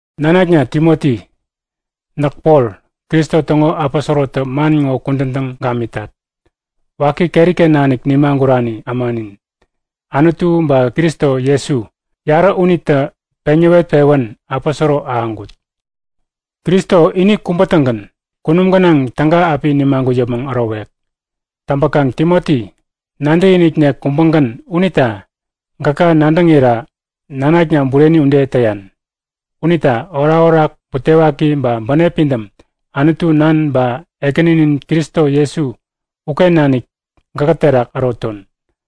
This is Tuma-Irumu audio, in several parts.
Nanakna Timoti, näk Pol, Kristo täŋo aposorotä man ŋo kudän täŋ gamitat. Waki keri-ken nanik nimagurani ämanin Anutu ba Kristo Jesu, yarä unitä peŋ näwet-pewän aposoro ahäŋkut. Kristo ini kubä-tägän kunum gänaŋ täga api nimagut yäpmäŋ ärowek. Täŋpäkaŋ Timoti, nadäkiniknek kubägän unita gäka nadäŋira nanakna bureni ude täyan. Unita orakorak, butewaki ba bänep pidäm Anutu Nan ba Ekäninin Kristo Jesu uken nanik gäkä terak äroton.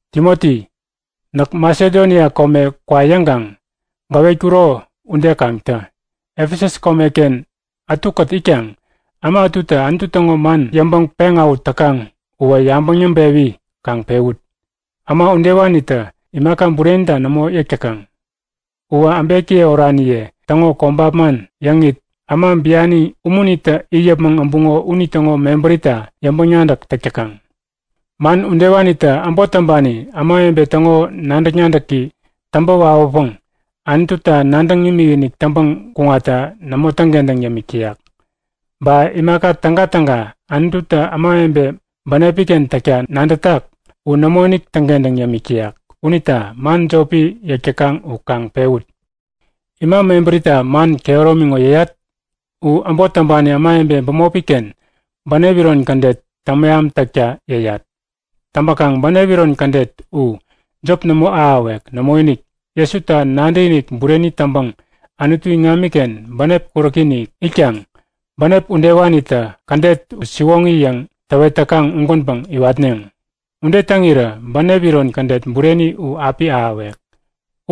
Timoti, näk Masedonia kome kwa yäŋkaŋ gäwetkuro ude kaŋ tä! Efesus komeken ätukät itkaŋ äma ätutä Anutu täŋo man yäŋpäŋ peŋawähut täkaŋ uwä yabäŋ yäŋpewi kaŋ pewut! Äma udewanitä imaka burenita nämo yäk täkaŋ. Uwä äbekiye oraniye täŋo kobap man yäŋit äma biani umunitä it yäpmäŋ äbuŋo unitäŋo mebärita yäŋpäŋ-nadäk täk täkaŋ. Man udewanitä äbot täŋpani ämawebe täŋo nadäk-nadäki täŋpä wawäpäŋ Anututa nadäŋ imikinik täŋpäŋ kuŋatta nämo täŋkentäŋ yämik täyak. Ba imaka tägatäga Anututä ämawebe bänepi-ken täkta nadätak u nämoinik täŋkentäŋ yämik täyak. Unita man jopi yäk täkaŋ u kaŋ pewut! Ima mebärita man kehäromi ŋo yäyat? U äbot täŋpani ämawebe bämopi-ken bänep iron kädet täŋmeham täkta yäyat. Täŋpäkaŋ bänep iron kädet u jop nämo ahäwek. Nämoinik, Jesuta nadäkinik bureni täŋpäŋ Anutu iŋamiken bänep kuräki-inik itkaŋ bänep udewanitä kädet u siwoŋi yäŋ täwet täkaŋ ugänpäŋ iwatneŋ. Ude täŋirä bänep iron kädet bureni u api ahäwek.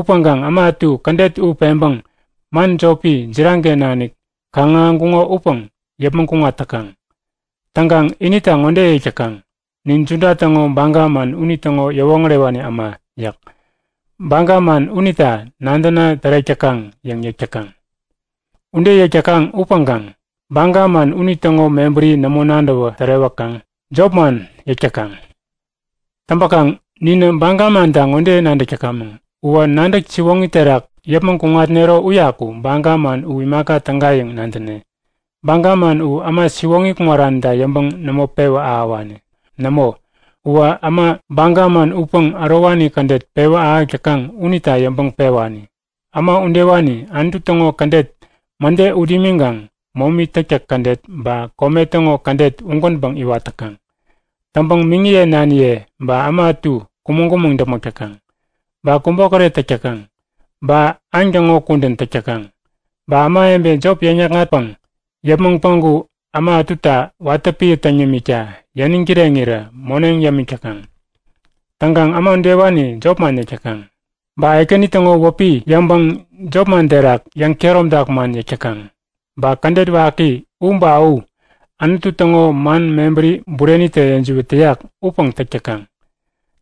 Upäŋkaŋ äma ätu kädet u peŋpäŋ man jopi, jiraŋ-ken nanik kaŋ-ahäŋkuŋo upäŋ yäpmäŋ kuŋat täkaŋ. Täŋkaŋ inita ŋode yäk täkaŋ; Nin Juda täŋo baga man unitäŋo yäwoŋärewani äma yäk. Baga man unita nadäna tärek täkaŋ yäŋ yäk täkaŋ. Ude yäk täkaŋ upäŋkaŋ baga man unitäŋo mebäri nämo nadäwä tärewäkaŋ jop man yäk täkaŋ. Täŋpäkaŋ ninä baga manta ŋode nadäk täkamäŋ; Uwä nadäk siwoŋi terak yäpmäŋ kuŋatnero uyaku baga man u imaka täga yäŋ nadäne. Baga man u äma siwoŋi kuŋaranita yäŋpäŋ nämo pewä ahäwani. Nämo uwä äma baga man utpäŋ ärowani kädet pewä ahäk täkaŋ unita yäŋpäŋ pewani. Äma udewani Anutu täŋo kädet mäde ut imiŋkaŋ momi täktäk kädet ba kome täŋo kädet ugänpäŋ iwat täkaŋ. Täŋpäŋ miŋiye naniye ba äma ätu kumäŋ-kumäŋ däpmäk täkaŋ. Ba kubokäret täk täkaŋ, ba aŋ täŋo kudän täk täkaŋ, ba ämawebe jop yäkŋatpäŋ yäpmäŋ päŋku äma ätuta watä piä täŋ yämikta yäniŋ kireŋirä moneŋ yämik täkaŋ. Täŋkaŋ äma udewani jopman yäk täkaŋ, ba Ekäni täŋo wäpi yäŋpäŋ jopman terak yäŋkehäromtak man yäk täkaŋ, ba kädet waki u ba u Anutu täŋo man mebäri burenitä yäjiwät täyak upäŋ täk täkaŋ.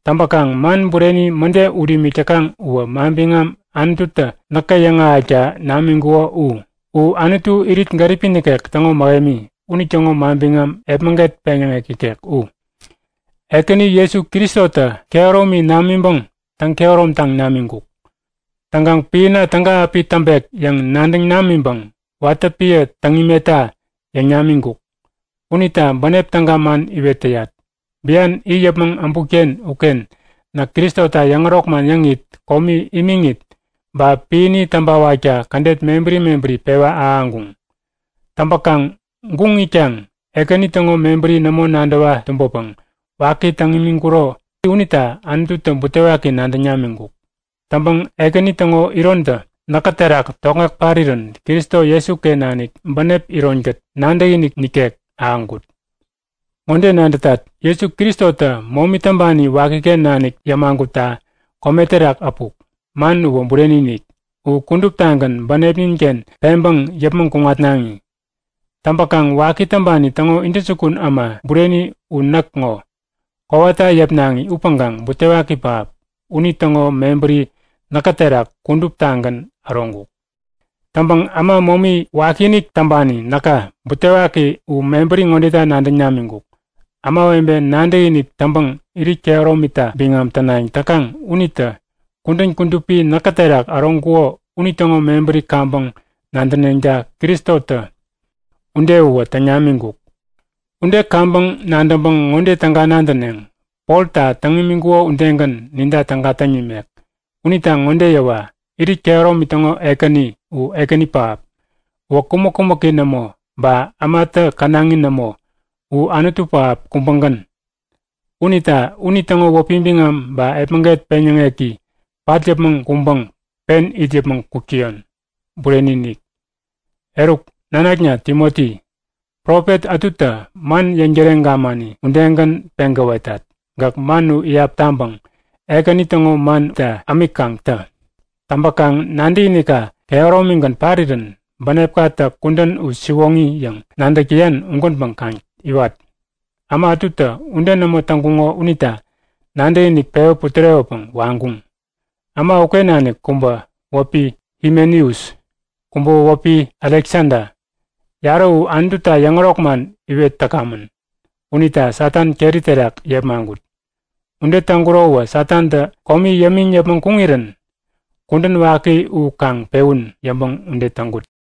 Täŋpäkaŋ man bureni mäde ut imik täkaŋ uwä manbiŋam Anututä näkä yäŋahäkta namiŋkuko u. U Anutu irit gäripi nikek täŋo mähemi, unitäŋo manbiŋam epmäget peŋyäŋek ikek u. Ekäni Jesu Kristotä kehäromi namiŋpäŋ täŋ-kehäromtaŋ namiŋkuk. Täŋkaŋ piäna täga api täŋpek yäŋ nadäŋ namiŋpäŋ watä piä täŋ imetta yäŋ namiŋkuk. Unita bänep täga man iwet täyat. Bian it yäpmäŋ äbutken uken näk Kristota yäŋärok man yäŋit, komi imiŋit ba piäni täŋpäwakta kädet mebäri mebäri pewa-ahäŋkuŋ. Täŋpäkaŋ guŋ itkaŋ Ekäni täŋo mebäri nämo nadäwa tumbäpäŋ waki täŋ imiŋkuro mebäri unita Anututä butewaki nadäŋ namiŋkuk. Täŋpäŋ Ekäni täŋo irontä näkä terak tokŋek parirän Kristo Jesuken nanik bänep ironkät nadäkinik nikek ahäŋkut. Ŋode nadä; Jesu Kristotä momi täŋpani wakiken nanik yämagutta kome terak äpuk. Man uwä bureni-inik. U kuduptagän bänepnin-ken peŋpäŋ yäpmäŋ kuŋatnaŋi. Täŋpäkaŋ waki täŋpani täŋo intäjukun äma bureni u näk ŋo. Kowata yäpnaŋi upäŋkaŋ butewaki pähap, unitäŋo mebäri näkä terak kuduptagän äroŋkuk. Täŋpäŋ äma momi wakiinik täŋpani näka butewaki u mebäri ŋodeta nadäŋ namiŋkuk. Ämawebe nadäkinik täŋpäŋ irit kehäromita biŋam tänayäŋ täkaŋ unitä kudän kudupi näkä terak äroŋkuko unitäŋo mebäri kaŋpäŋ nadäneŋta Kristotä ude uwä täŋ namiŋkuk. Ude kaŋpäŋ nadäŋpäŋ ŋode täga nadäneŋ; Polta täŋ imiŋkuko udegän ninta täga täŋ nimek. Unita ŋode yäwa! Irit kehäromi täŋo Ekäni u ekäni pähap. Uwä kumäk-kumäki nämo ba ämatä känaŋi nämo. U Anutu pähap kubägän. Unita unitäŋo wäpi biŋam ba epmäget peŋyäŋeki pat yäpmäŋ kuŋpäŋ pen it yäpmäŋ kuk täyon. Bureni-inik! Eruk, nanakna Timoti, profet ätutä man yäŋtäreŋ gamani udegän peŋ gäwetat. Gäk man u iyap taŋpäŋ Ekäni täŋo man unita yäŋpäŋ ämik kaŋ tä. Täŋpäkaŋ nadäkinikka kehäromigän parirän bänepkatä kudän u siwoŋi yäŋ nadäk täyan ugänpäŋ kaŋ iwat. Äma ätutä ude nämo täŋkuŋo unita nadäkiniki pewä putärewäpäŋ waŋkuŋ. Äma uken nanik kubä wäpi Himeneus. Kubäwä wäpi Aleksada. Yarä u Anututa yäŋärok man iwet täkamän unita Satan keri terak yepmaŋkut. Ude täŋkurowä Satantä komi yämiŋ yäpmäŋ kuŋirän kudän waki u kaŋ pewun yäŋpäŋ ude täŋkut.